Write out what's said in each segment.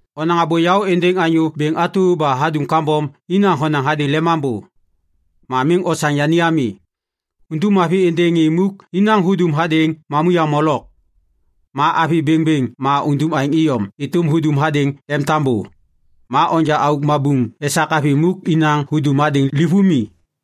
Onaŋ abô yaô êndêŋ anyô bêŋ atu ba hadum kambom inaŋ honaŋ hadêŋ lemambô. Ma miŋ osaŋ yani ami. Undum mavi êndêŋ ŋê muk inaŋ hudum hadêŋ mamuyaŋ molok. Ma avi bêŋbêŋ ma undum aêŋ iyom êtôm hudum hadêŋ lemtambô. Ma onja auk mabuŋ esak avi muk inaŋ hudum hadêŋ livômi.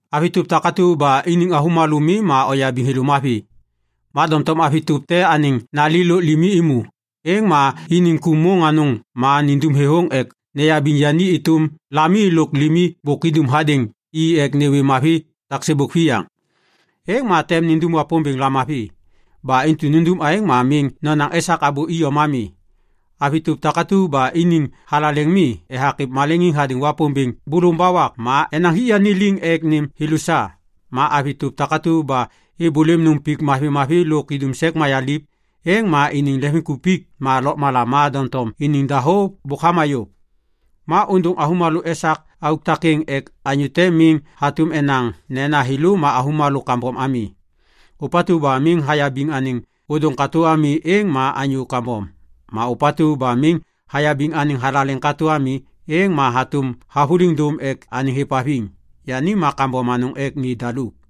Avi tôp takatu ba iniŋ avômalô mi ma oyabiŋ thêlô mavi. Ma doŋtom avi tôp te anêŋ nali lôk limi êmô, êŋ ma iniŋ ku môŋ anôŋ ma nindum thêthôŋ ek neyabiŋ yani êtôm lami lôk limi bôk idum hadêŋ i ek nêwê mavi taksêbôk viyaiŋ. Êŋ ma tem indum Wapômbêŋ lamavi. Ba intu nundum aêŋ ma miŋ nonaŋ esak abô iyom ami. Avi tôp takatu ba iniŋ thalaleŋ mi ethak êv maleŋiŋ hadêŋ Wapômbêŋ bôlôvôŋ ba wak ma enaŋ hik yani liŋ ek nêm thêlô sa. Ma avi tôp takatu ba êbôlêm nôm pik mavimavi lôk idum sek mayaliv, êŋ ma iniŋ leŋviŋkupik ma lôkmala ma doŋtom iniŋ dahô bôk hama yôv. Ma ôndôŋ avômalô esak auk takêŋ ek anyô te miŋ hatôm enaŋ nena thêlô ma avômalô kambom ami. Ôpatu ba miŋ hayabiŋ anêŋ ôdôŋ katô ami êŋ ma anyô kambom. Ma ôpatu ba miŋ hayabiŋ anêŋ thalaleŋ katô ami, êŋ ma hatôm havôliŋ dôm ek anêŋ hêvhaviŋ. Yani ma kambom anôŋ ek ŋê daluk.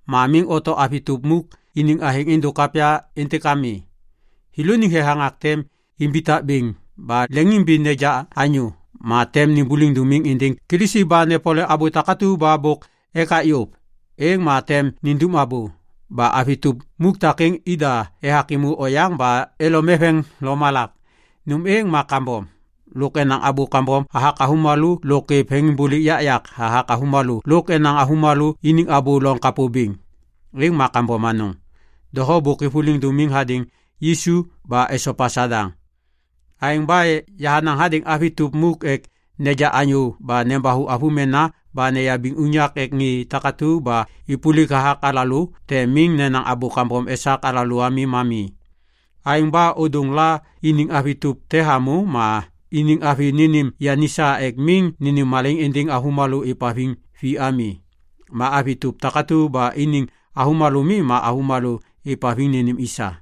Ma miŋ oto avi tôp muk iniŋ athêŋ êndôk kapya êntêk ami. Thêlôniŋ thethaŋak tem imbitak bêŋ ba leŋiŋimbiŋ neja anyô ma tem nêmbôliŋ dômiŋ êndêŋ Kilisi ba nepole abô takatu ba bôk ekak yôv. Êŋ ma tem nindum abô. Ba avi tôp muk takêŋ ida ethak êmô oyaŋ ba elom eveŋ lomalak. Nôm êŋ ma kambom. Lôk enaŋ abô kambom hathak avômalô lôk êv veŋiŋbôlêk yakyak hathak avômalô lôk enaŋ avômalô iniŋ abô loŋ kapô bêŋ. Êŋ ma kambom anôŋ. Doho bôk êvôliŋ dômiŋ hadêŋ Yisu ba esopa Sadaŋ. Aêŋ ba yahanaŋ hadêŋ avi tôp muk ek neja anyô ba nembathu avômena ba neyabiŋ unyak ek ŋê takatu ba êpôlik hathak alalô tem miŋ nenaŋ abô kambom esak alalô ami ma mi. Aêŋ ba ôdôŋ la iniŋ avi tôp te hamô, ma iniŋ avi nênêm yani sa ek miŋ nênêm malaiŋ êndêŋ avômalô êvhaviŋ vi ami. Ma avi tôp takatu ba iniŋ avômalô mi ma avômalô êvhaviŋ nênêm i sa.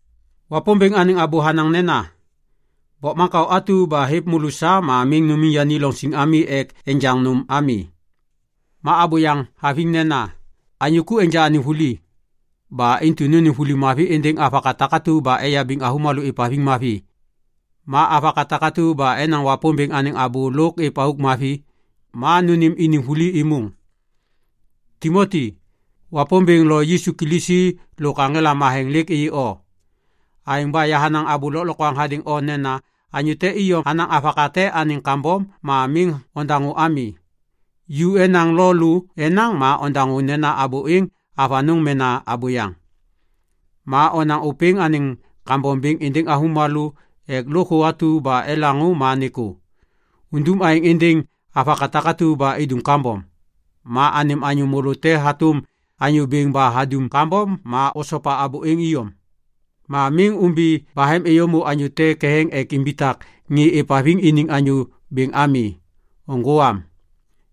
Wapômbêŋ anêŋ abô hanaŋ nena, “Bokmaŋkao atu ba hêv môlô sa ma miŋ numiŋ yani loŋ siŋ ek enjaŋ nôm ami.” Ma abô yaŋ haviŋ nena, “Anyô ku enja anêŋ vuli.” Ba intu nônêm vuli mavi êndêŋ avaka takatu ba eyabiŋ avômalô êvhaviŋ mavi. Ma avaka takatu ba enaŋ Wapômbêŋ anêŋ abô lôk êv auk mavi, ma nônêm iniŋ vuli êmôŋ. Timoti, Wapômbêŋ lo Yisu Kilisi lôk aŋela matheŋ lêk êyê o. Aêŋ ba yahanaŋ abô lôklokwaŋ hadêŋ o nena anyô te iyom hanaŋ avaka te anêŋ kambom ma miŋ ondaŋô ami. Ju mena lô la enaŋ ma ondaŋô nena abô êŋ avanôŋ mena abôyaŋ. Ma onaŋ ôpêŋ anêŋ kambom bêŋ êndêŋ avômalô ek lôkthô atu ba elaŋô ma nêkô. Undum aêŋ êndêŋ avaka takatu ba idum kambom. Ma anêm anyô môlô te hatôm anyô bêŋ ba hadum kambom ma osopa abô êŋ iyom. Ma miŋ ômbi bahem êyômô anyô te ketheŋ ek imbitak ŋê êvhaviŋ iniŋ anyô bêŋ ami. Nôŋgô am.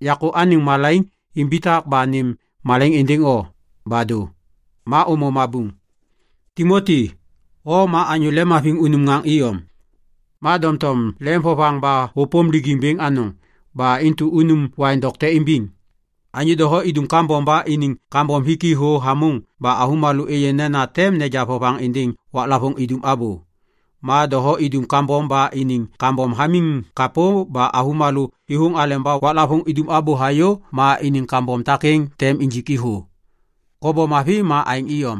Yakô anêŋ malaiŋ imbitak ba nêm malaiŋ êndêŋ o. Ba dô. Ma ômô mabuŋ. Timoti, o ma anyô lemhaviŋ unum ŋaŋ iyom. Ma doŋtom lemvovaŋ ba hôpôm lijiŋ bêŋ anôŋ. Ba intu unum waiŋ dokte imbiŋ. Anyô doho idum kambom ba iniŋ kambom hik i thô hamôŋ ba avômalô êyê nena tem neja vovaŋ êndêŋ waklavôŋ idum abô. Ma doho idum kambom ba iniŋ kambom hamiŋ kapô ba avômalô êthôŋ aleba waklavôŋ idum abô hayô ma iniŋ kambom takêŋ tem injik i thô. Kobom mavi ma aêŋ iyom.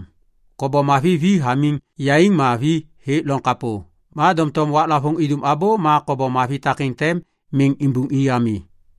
Kobom mavi vi hamiŋ yaiŋ ma vi hêk loŋ kapô. Ma doŋtom waklavôŋ idum abô ma kobom mavi takêŋ tem miŋ imbuŋi ami.